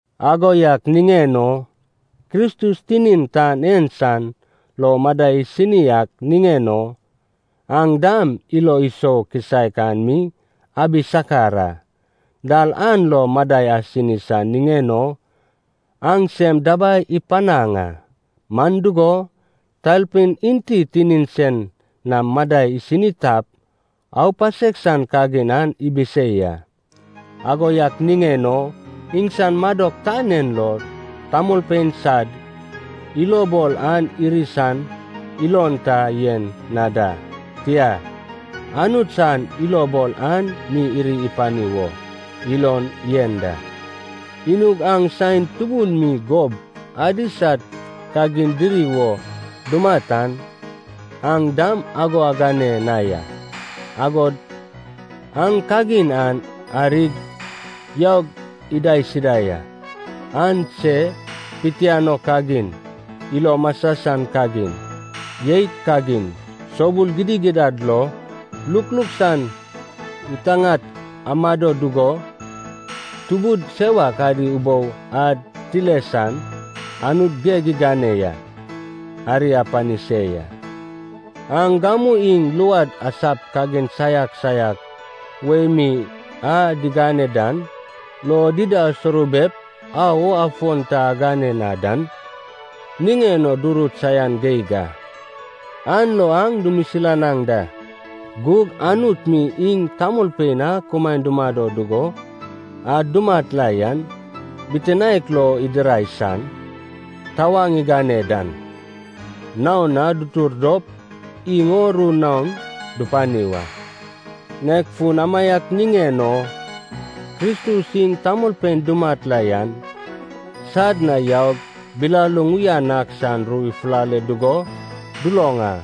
Ago yak niŋen o, Kristus tinin tan en san lo madai isini ak niŋen o, aŋ dam ilo isou kisaek an mi abi sakar a. Dal an lo madai asini san niŋen o aŋ sem dabai ipanaŋ a, man dugo, talpein enti tinin sen nam madai isini tap, aupasek san kagin an ibisei a. Ago yak niŋen o iŋsan madok tan en lo tamolpein sad ilobol an iri san ilon ta yen na da. Tia, Anut san ilobol an mi iri ipani wo ilon yen da. Inug aŋ saen tubun mi gob adi sad kagin diri wo dumat an aŋ dam ago agane na ya. Agod aŋ kagin an arig yaug idaisida ya. Aŋ se pitianoi kagin, ilo masa san kagin, jeit kagin, soubul gidigidad lo, lukluk san ŋitaŋat amado dugo, tubud sewak adi ubou ad tile san Anut geg igane yan ari apani se ya. Aŋ gamu iŋ luad asap kagin saiak saiak wei mi a digane dan lo dida asourubep, au o afon ta agane na dan niŋen o durut saian geig a. An lo aŋ dumisilanaŋ da. Gug Anut mi iŋ tamolpein a kumaen dumado dugo a dumat la yan bitinaek lo idirai san tawaŋ igane dan, naon na dutur dop iŋ o ru naon dupani wa. Nek fun amaiak niŋen o Kristus iŋ tamolpein dumat la yan sad na yaug bilaluŋ uyan ak san ru ifulale dugo duloŋ a.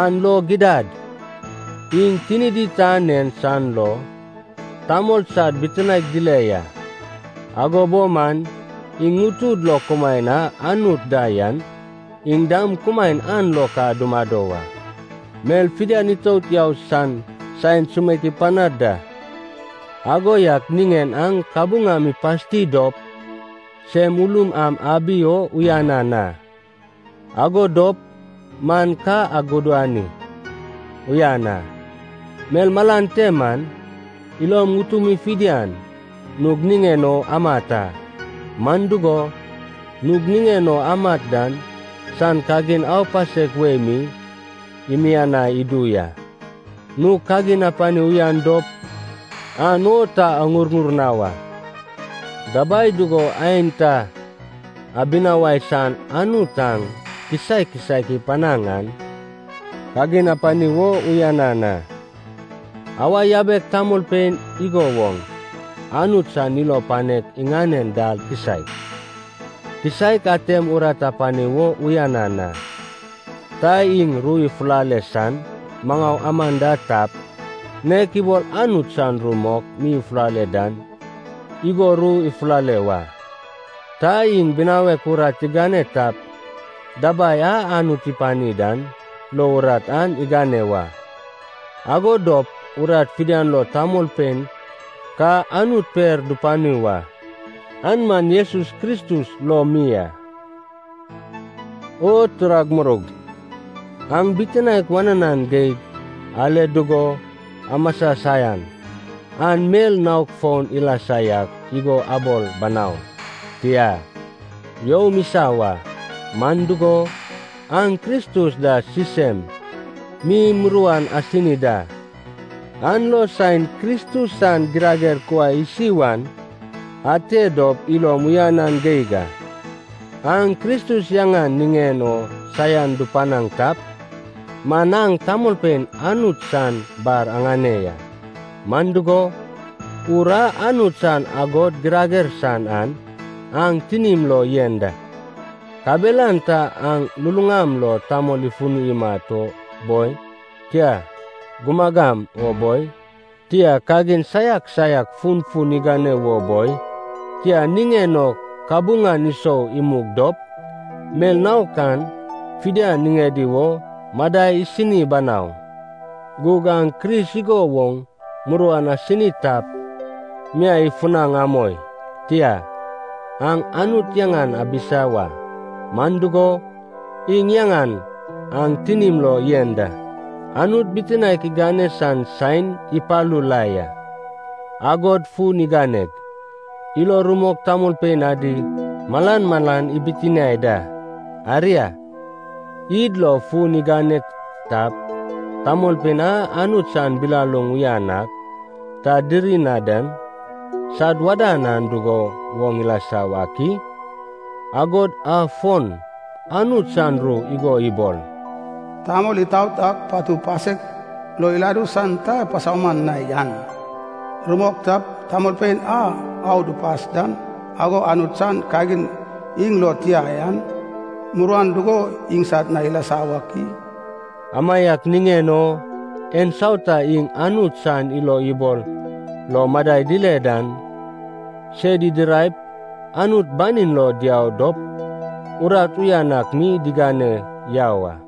An lo gidad, iŋ tinidi tan en san lo tamol sad bitinaek dile ya, ago bo man iŋ ŋutud lo kumaen a Anut da yan, iŋ dam kumaen an lo ka dumado wa. Mel fidian itout yau san saen sumeik ipanad da. Ago yak niŋen aŋ kabuŋam ipasti dop sem ulum am abi o uyanan a. Ago dop man ka agudani uyan a. Mel malan te man ilom ŋutumi fidian nug niŋen o amat a. Man dugo, nug niŋen o amat dan san kagin aupasek wei mi imianai idu ya. Nug kagin apani uyan dop, an o ta aŋurŋur na wa. Dabai dugo aenta abinawai san Anut aŋ kisaek kisaek ipanaŋ an kagin apani wo uyanan a. Awa yabek tamolpein igo woŋ Anut san ilo panek iŋanen dal kisaek kisaek atem urat apani wo uyanan a. Ta iŋ ru ifulale san maŋau aman da tap, nek ibol Anut san ru mok mi ifulale dan igo ru ifulale wa. Ta iŋ binawek urat igane tap, dabai a Anut ipani dan lo urat an igane wa. Ago dop urat fidian lo tamolpein ka Anut per dupani wa, an man Jesus Kristus lo mi a. O turag muroug, aŋ bitinaek wananan geig ale dugo amasa saian an mel naok foun ilasa yak igo abol banau. Tia, youm isa wa, man dugo, aŋ Kristus da sisem mi muruan asini da. An lo saen Kristus san girager kuai isi wan ate dop ilom uyanan geig a. Aŋ Kristus yaŋan niŋen o saian dupanaŋ tap man aŋ tamolpein Anut san bar aŋane ya, man dugo, Ur a Anut san agod girager san an aŋ tinim lo yen da. Kabelan ta aŋ luluŋam lo tamol ifuni imat o boi, tia gumagam o boi, tia kagin saiak saiak funfun igane wo boi, tia, ŋiŋeŋ o kabuŋan isou imug dop, mel naok an fidian niŋedi wo madai isini banau. Gug aŋ Kris igo woŋ muruan asini tap, miai ifunaŋ amoi. Tia, aŋ Anut yaŋan abisa wa. Man dugo, iŋ yaŋan aŋ tinim lo yen da. Anut bitinaek igane san saen ipalu la ya. Agod fun iganeg, ilo rumok tamolpein adi malan malan ibitiniai da. Aria, id lo fun igane tap, tamolpein a Anut san bilaluŋ uyan ak ta diri na dan sad wadan an dugo woŋ ilasa wak i? Agod afon, Anut san ru igo ibol, “Tamol itaot ak patu pasek lo iladu san ta pasauman na yan rumok tap, tamolpein a au dupas dan ago Anut san kagin iŋ lo tia yan muruan dugo iŋsad na ilasa wak i?” Amaiak niŋen o, ensauta iŋ Anut san ilo ibol lo madai dile dan, sed idiraip Anut banin lo diau dop urat uyan ak mi digane yau a.